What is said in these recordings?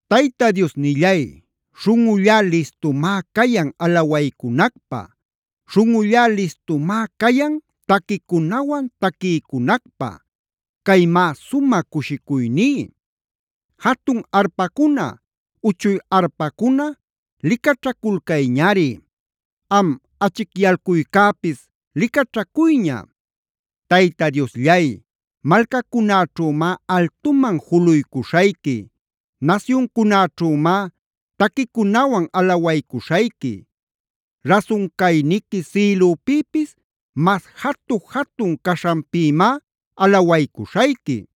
Tayta Diosnillay, śhunꞌullá listumá cayan alawaycunacpä. Śhunꞌullá listumá cayan taquicunawan taquiycunacpä. Caymá sumä cushicuyní. Jatun arpacuna, uchuy arpacuna licaćhaculcayñari. Am achicyalcuycäpis licaćhacuyña. Tayta Diosllay, malcacunäćhümá altuman juluycuśhayqui. Nasyuncunäćhümá taquicunawan alawaycuśhayqui. Rasun cayniqui sïlüpïpis mas jatu-jatun caśhanpïmá alawaycuśhayqui.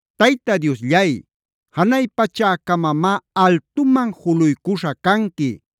Tayta Diosllay, ¡janay pachäcamamá altuman juluycuśha canqui!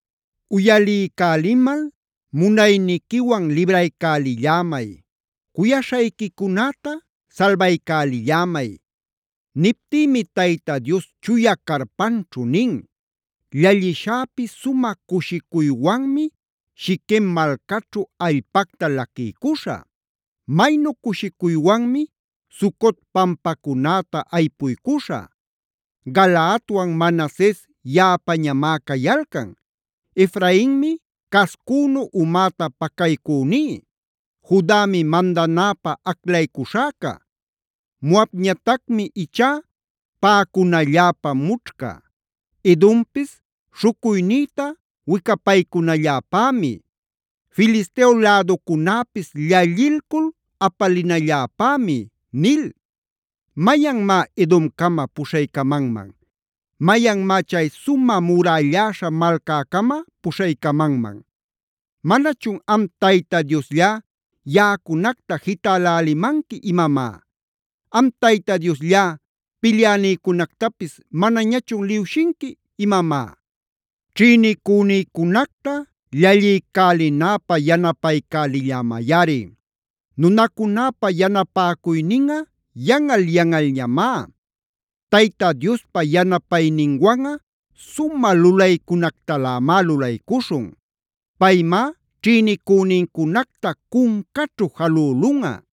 Uyaliycälimal munayniquiwan libraycälillämay. Cuyaśhayquicunäta salbaycälillämay. Niptïmi Tayta Dios chuya carpanćhu nin: “Llallishäpi sumä cushicuywanmi Shiquem malcaćhu allpacta laquiycuśhä. Maynu cushicuywanmi Sucot pampacunäta aypuycuśhä. Galaadwan Manases yaꞌapañamá cayalcan. Efrainmi cascünu umäta pacaycüní. Judami mandanäpä aclaycuśhäca. Moabñatacmi ichá paꞌacunalläpä mućhca. Edompis śhucuynïta wicapaycunalläpämi. Filisteo läducunäpis llallilcul apalinalläpämi” nil. ¿Mayanmá Edomcama puśhaycamanman? ¿Mayanmá chay sumä murälläśha malcäcama puśhaycamanman? ¿Manachun am Tayta Diosllá, yaꞌacunacta jitälälimanqui imamá? ¿Am Tayta Diosllá, pilyänïcunactapis manañachun liwshinqui imamá? Ćhïnicünïcunacta llalliycälinäpä yanapaycälillämayꞌari. Nunacunäpa yanapäcuyninꞌa yanꞌal-yanꞌalñamá. Tayta Diospa yanapayninwanꞌa sumä lulaycunactalämá lulaycuśhun. Paymá ćhïnicünïcunacta cuncaćhu jalülunꞌa.